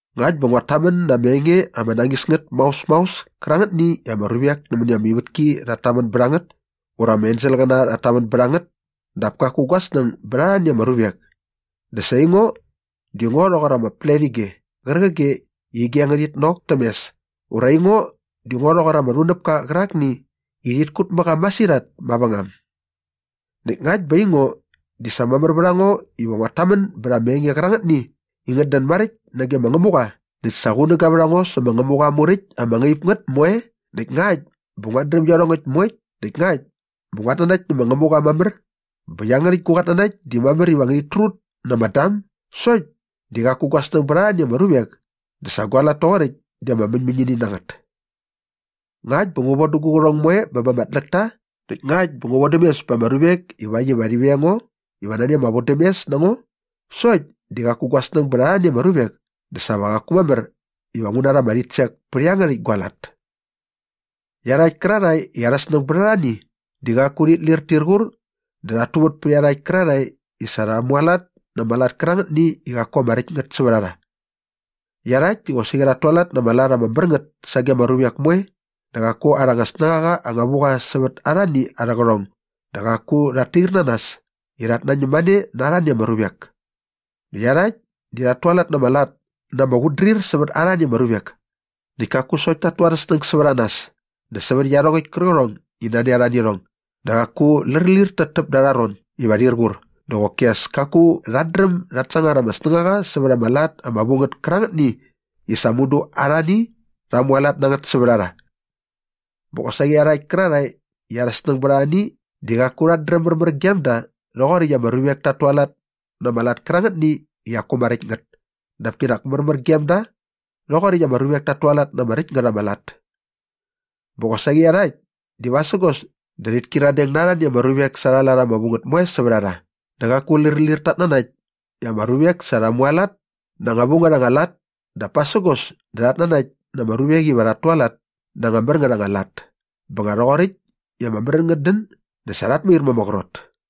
Ngakt bä nguat tamän na ama enge ama nañis ngät maos maos kärangätni i ama ruvek nämäni ama ivätki rhat tamän bät a ngät ura ama enselqäna rhat tamän bät a ngät dap kaku gua snäng bät arhani ama ruvek dä sa aingo di ngo rhoqor ama pletige qärqige i ige ngärhit nok täm mes ura aingo di ngo rhoqor ama rhunäpka qärakni i rhit kut mä qa masirhat mavängam. Näkt ngakt bä aingo di sa mamär vät a ngo iva nguat tamän bät ama enge qärangätni i ngät dän maräkt nage ma Ngämuqa näkt sa qunäga vät a ngo sä ma Ngämuqa aa muräkt ama ngaip ngät moe näkt ngakt bä nguat dräm iarhongäkt moe näkt ngakt bä nguat nanakt nä ma Ngämuqa mamär bä iangärhäkt gu qatnanakt di mamär iva ngärhit trut na ama dam sokt di qaku gua snäng bät arhani ama ruvek dä sa gua lat toqoräkt di ama mäñmäñini na ngät. Ngakt bä ngu von dä gu qärhong moe bä ba ama tläkta näkt ngakt bä ngu vodäm mes ba ama ruvek ivakt iva rhi veng ngo iva nani ama vodämes na ngo sokt di qaku gua snäng bät arhani ama ruvek dä sa va qaku mamär iva ngu rha ama rhitsek pät iangärhäkt gua lat. Iarhakt kärarhae i arha snäng bät arhani di qaku rhit lir tir qur dä rhat tuvät pät iarhakt kärarhae i sa rha mualat na ama lat kärangätni i qaku ama räkt ngät sävät a rha. Iarhakt di qosaqi rhat tualat na ama lat ama mär ngät sage ama ruvek moe dä qaku arha anga snängaqa anga vu qa sävät arhani arhä qärhong dä qaku rhat tair na nas i rhat nañäm mane na arhani ama ruvek. Dä iarhakt di rhat tualat na ama lat na ama qutdrir sävät arhani ama ruvek. Näkt kaku sokt ta tu arhä snäng sävät a nas dä sävät iarhongäkt kärqärhong i nani a rha nä irhong dä qaku lärlir täptäp da arha ron iva rhir qur dä qoki as kaku rhat dräm dat sangar ama snängaqa sävät ama lat ama vu ngät kärangätni i sa mudu arhani rha mualat na ngät sävät a rha. Bä qosaqi iarhakt kärarhae i arha snäng bät arhani di qaku rhat dräm märmär gem da rhoqoräkt i ama ruvek tat tualat na ama lat kärangätni i qaku ama räkt ngät dap kinak märmär gem da rhoqoräkt i ama ruvek tat tualat na ama räkt ngät ama lat. Bä qosaqi iarhakt di vasägos dä rhit kyiradeng na arhani ama ruvek sa arha lat ama vu ngät moe sävät a rha dä qaku lärlir tat nanakt i ama ruvek sa rha mualat na anga vu ngät anga lat dap pasägos dä rhat nanakt na ama ruvek iva rha rhualat na anga mär ngät anga lat bä nga rhoqoräkt i ama märän ngät dän dä sa rhat mair ma ama qrot.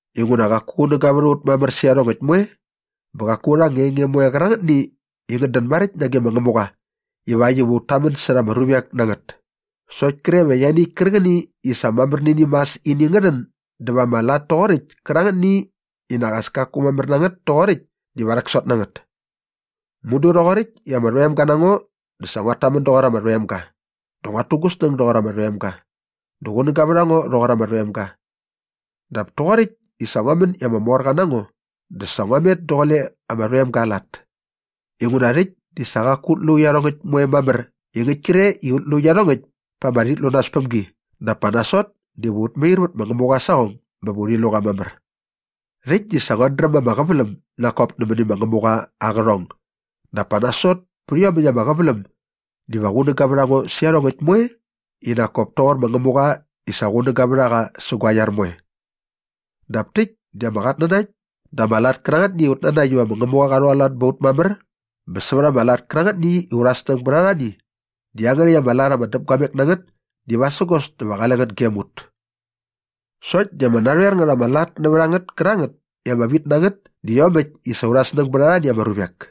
Inguna qaku qunäga vät a ut mamär sä iarhongäkt moe bä qaku aurha anga enge moe qärangätni i ngät dän maräkt nage ma Ngämuqa ivakt iva ut tamän särha ama ruvek na ngät sokt kre va ianiäkt kärqäni i sa mamär nä ini mas ini ngä rhän dä va ama lat toqoräkt kärangätni i nak as kaku mamär na ngät toqoräkt diva rhäksot na ngät. Mudu rhoqoräkt i ama rhoemga na ngo dä sa nguat tamän doqor ama rhoemga dä nguat tu gu snäng doqor ama rhoemga dä qunäga vät a ngo rhoqor ama rhoemga. Dap toqoräkt i sa ngua män i ama morqa na ngo dä sa ngua met daqule ama rhoemga aa lat. Inguna rhäkt di sa qaku ut lu iarhongäkt moe mamär i ngäkt kre ut lu iarhongäkt pa ama rhitlunaspämgi dap pa nasot diva ut mair vät ma Ngämuqa aa saqong bä va urhi lu qa mamär. Rhäkt di sa nguat dräm ama qäväläm nak kop nämäni ma Ngämuqa aa qärhong dap pa nasot pät iomäkt ama qäväläm diva qunäga vät a ngo sä iarhongäkt moe i nak kop toqor ma Ngämuqa i sa qunäga vät a qa sä gua iar moe. Dap täkt di ama qatnanakt dä ama lat kärangätni i ut nanakt iva ma Ngämuqa qa rhualat bä ba ut mamär bä sävät ama lat kärangätni i aurha snäng bät arhani di iangärhäkt ama lat ama däpguamek na ngät di vasägos dä va qale ngät gem ut. Sokt di ama narhoer ngät ama lat nävät a ngät kärangät i ama vit na ngät di iomäkt i sa aurha snäng bät arhani ama ruvek.